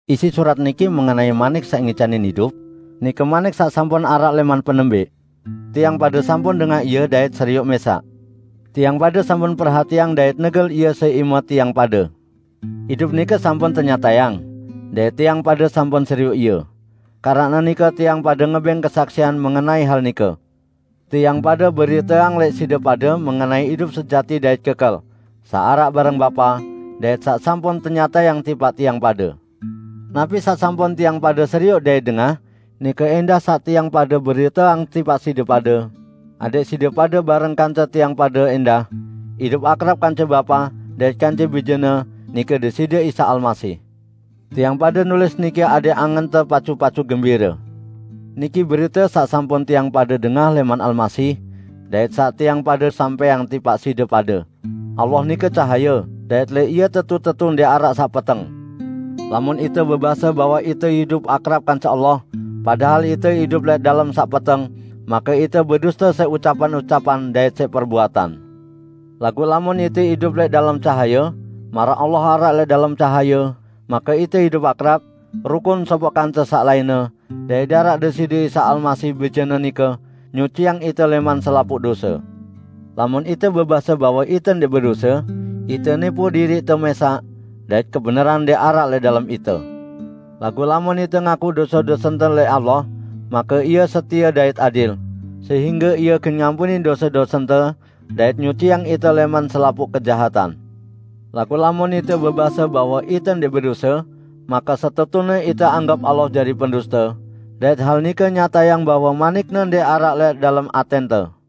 Isi surat niki mengenai Manik saq ngicanin idup, nike Manik saq sampun araq lẽman penembẽq. Tiang pade sampun dengah ie dait serioq mẽsaq. Tiang pade sampun perhatiang dait negel ie siq ime tiang pade. Idup nike sampun tenyatayang, dait tiang pade sampun serioq ie. Keranaq nike tiang pade ngebẽng kesaksian mengenai hal nike. Tiang pade beriteang lẽq side pade mengenai idup sejati dait kekel, saq araq bareng Bapa, dait saq sampun tenyatayang tipaq tiang pade. Napi saq sampun tiang pade serioq dait dengah, nike ẽndah saq tiang pade beriteang tipaq side pade, adẽq side pade bareng kance tiang pade ẽndah, idup akrab kance Bapa dait kance Bije-Ne, nike Deside Isa Almasih. Tiang pade nulis niki adẽq angente pacu-pacu gembire. Niki berite saq sampun tiang pade dengah lẽman Almasih, dait saq tiang pade dait saq tiang pade sampẽang tipaq side pade: Allah nike cahaye, dait lẽq Ie tetu-tetu ndẽq araq saq peteng. Lamun ite bebase bahwe ite idup akrab kance Allah, padahal ite idup lẽq dalem saq peteng, make ite beduste siq ucapan-ucapan dait siq perbuatan. Laguq lamun ite idup lẽq dalem cahaye, maraq Allah araq lẽq dalem cahaye, make ite idup akrab, rukun sopoq kance saq lainne, dait daraq Deside Isa Almasih, Bije-Ne nike, nyuciang ite lẽman selapuq dose. Lamun ite bebase bahwe ite ndẽq bedose, ite nipu diriqte mẽsaq; dait kebenaran ndẽq araq lẽq dalem ite. Laguq lamun ite ngaku dose-dosente lẽq Allah, make Ie setie dait adil, sehingge Ie gen ngampunin dose-dosente dait nyuciang ite lẽman selapuq kejahatan. Laguq lamun ite bebase bahwe ite ndẽq bedose, make setetune ite anggep Allah jari penduste, dait hal nike nyatayang bahwe Manik-Ne ndẽq araq lẽq dalem atẽnte.